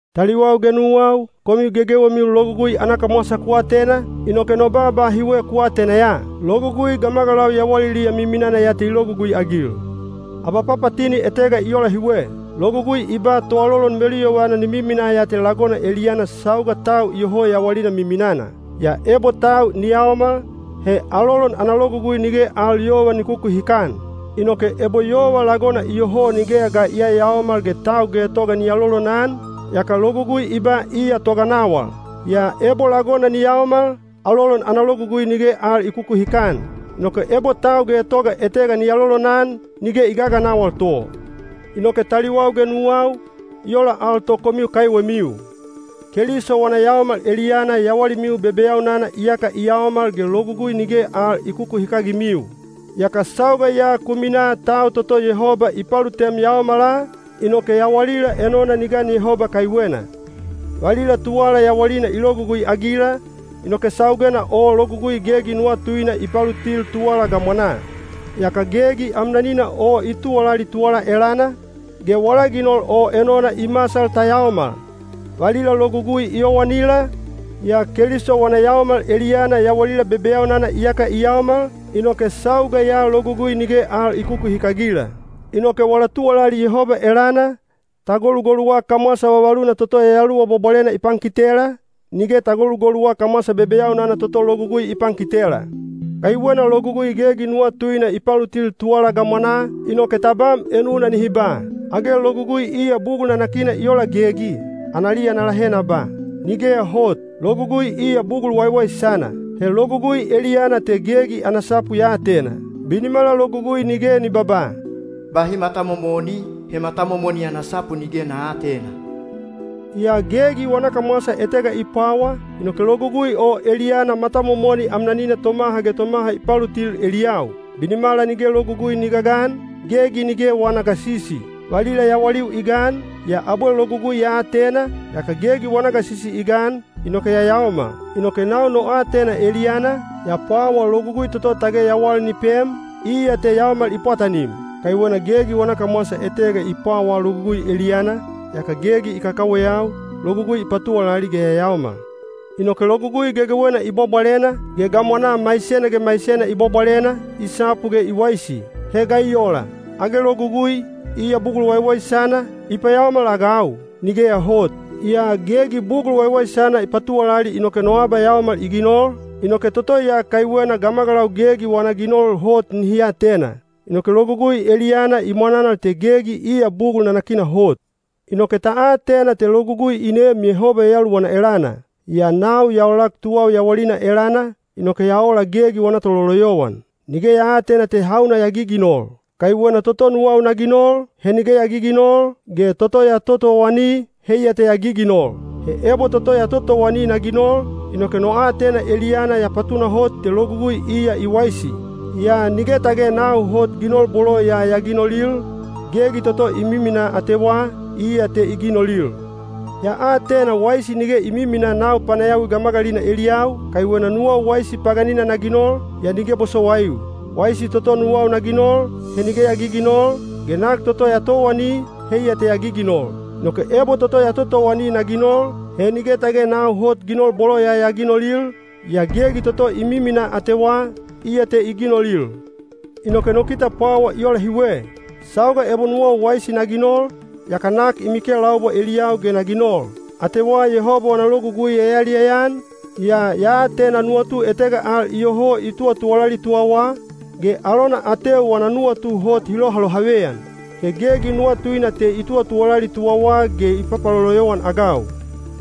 Taliwau ge nuwau, komiu gegewemiu logugui ana kamwasa ku atena, inoke no baaba hiwe ku atena ya: logugui gamagalau yawaliliya miminana ya te i logugui-agil. Abapapatini etega i ola hiwe: logugui i ba toalolon meluyovana ni miminaa ya te lagona eliyana sauga tau iyoho yawalina miminana. Yaa ebo tau ni yaomal, he alolon ana logugui nige al yova ni kukuhikan. Inoke ebo yova lagona iyoho nigeya ga i yayaomal ge tau getoga ni alolonan, yaka logugui i ba iya toganawal. Yaa ebo lagona ni yaomal, alolon ana logugui nige al i kukuhikan. Inoke ebo tau getoga etega ni alolonan, nige i gaganawal to. Inoke taliwau ge nuwau, i ola al to komiu kaiwemiu. Keliso wana yaomal eliyana yawalimiu bebeyaunana iyaka i yaomal ge Logugui nige al i kukuhikagimiu. Yaka sauga ya ku minaa tau toto Yehoba i palutem yaomala, inoke yawalila enona ni gan Yehoba kaiwena. Valila tuwala yawalina i logugui-agila, inoke saugena o Logugui gegi nuwatuina i palutil tuwala gamwanaa. Yaka gegi amnanina o i tuwalali tuwala elana, ge wala ginol o enona i masal ta yaomal. Valila Logugui i yowanila, yaa Keliso wana yaomal eliyana yawalila bebeyaunana iyaka i yaomal, inoke sauga ya Logugui nige al i kukuhikagila. Inoke wala tuwalali Yehoba elana, ta golugoluwa kamwasa vavaluna toto Yayaluwa Bwabwalena i pankitela, nige ta golugoluwa kamwasa bebeyaunana toto Logugui i pankitela. Kaiwena Logugui gegi nuwatuina i palutil tuwala gamwanaa, inoke tabam enuna nihi ba, “Age logugui iya bugul nanakina i ola gegi?” Analiya na lahe na ba, “Nigeya hot! Logugui iya bugul waiwaisana.” He logugui eliyana te gegi ana sapu ya atena. Binimala logugui nige ni babaa, “Bahi matamomoni,” he matamomoni ana sapu nige na aatena. Yaa gegi wana kamwasa etega i pwawa, inoke logugui o eliyana matamomoni amnanina tomaha ge tomaha i palutil eliyau. Binimala nige logugui ni gagan, gegi nige wana gasisi. Valila yawaliu i gan, yaa abwe logugui ya atena, yaka gegi wana gasisi i gan, inoke ya yaomal. Inoke nau no aatena eliyana, ya pwawa logugui toto tage yawal ni pem, iya te yaomal i pwatanim. Kaiwena gegi wana kamwasa etega i pwawaa logugui eliyana, yaka gegi i kakaweyau, logugui i patuwalali ge ya yaomal. Inoke Logugui gegewena i bwabwalena, ge gamwanaa maisena ge maisena i bwabwalena, i sapu ge i waisi. He ga i ola? Age Logugui, iya bugul waiwaisana, i payaomal-agau? Nigeya hot! Yaa gegi bugul waiwaisana i patuwalali inoke no abayaomal i ginol, inoke toto ya kaiwena gamagalau gegi wana ginol hot nihi atena. Inoke logugui eliyana i mwananal te gegi iya bugul nanakina hot. Inoke ta atena te logugui i neem Yehoba Yayaluwana elana; yaa nau ya olak tuwau yawalina elana, inoke ya ola gegi wana tololoyowan. Nige ya aatena te hauna ya giginol. Kaiwena toto nuwau na ginol, he nige ya giginol, ge toto ya totowani, heiya te ya giginol. He ebo toto ya totowani na ginol, inoke no aatena eliyana ya patunahot te logugui iya i waisi. Yaa nige tage nau hot ginol bolo ya ya ginolil, gegi toto i miminaa atewa, iya te i ginolil. Ya atena waisi nige i miminaa nau panayawi gamagalina eliyau, kaiwena nuwau waisi paganina na ginol, yaa nige bosowaiu. Waisi toto nuwau na ginol, he nige ya giginol, ge nak toto ya towani, heiya te ya giginol. Inoke ebo toto ya totowani na ginol, he nige tage nau hot ginol bolo ya ya ginolil, yaa gegi toto i miminaa atewa, iya te i ginolil. Inoke no kite pwawa i ola hiwe: sauga ebo nuwau waisi na ginol, yaka nak i mikelaubwa eliyau ge na ginol. Atewa Yehoba wana logugui ya yaliyaya-an, yaa ya atena nuwatu etega al iyoho i tuwatuwalali tuwawa, ge alona ateu wana nuwatu hot hi lohalohaveyan. He gegi nuwatuina te i tuwatuwalali tuwawa ge i paloloyowan-agau.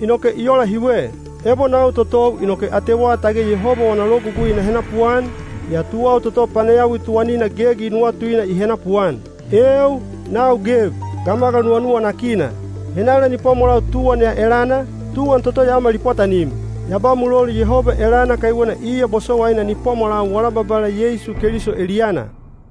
Inoke i ola hiwe: ebo nau totou inoke atewa tage Yehoba wana logugui na henapuan, yaa tuwau toto panayawi tuwanina gegi nuwatuina i henapuan. Eeu! Nau geb, gamagal nuwanuwanakina! Henala ni pwamwalau tuwan ya elana, tuwan toto yaomal i pwatanim? Ya ba mulolu Yehoba elana kaiwena iya bosowaina ni pwamwalau wala Babala Yeisu Keliso eliyana.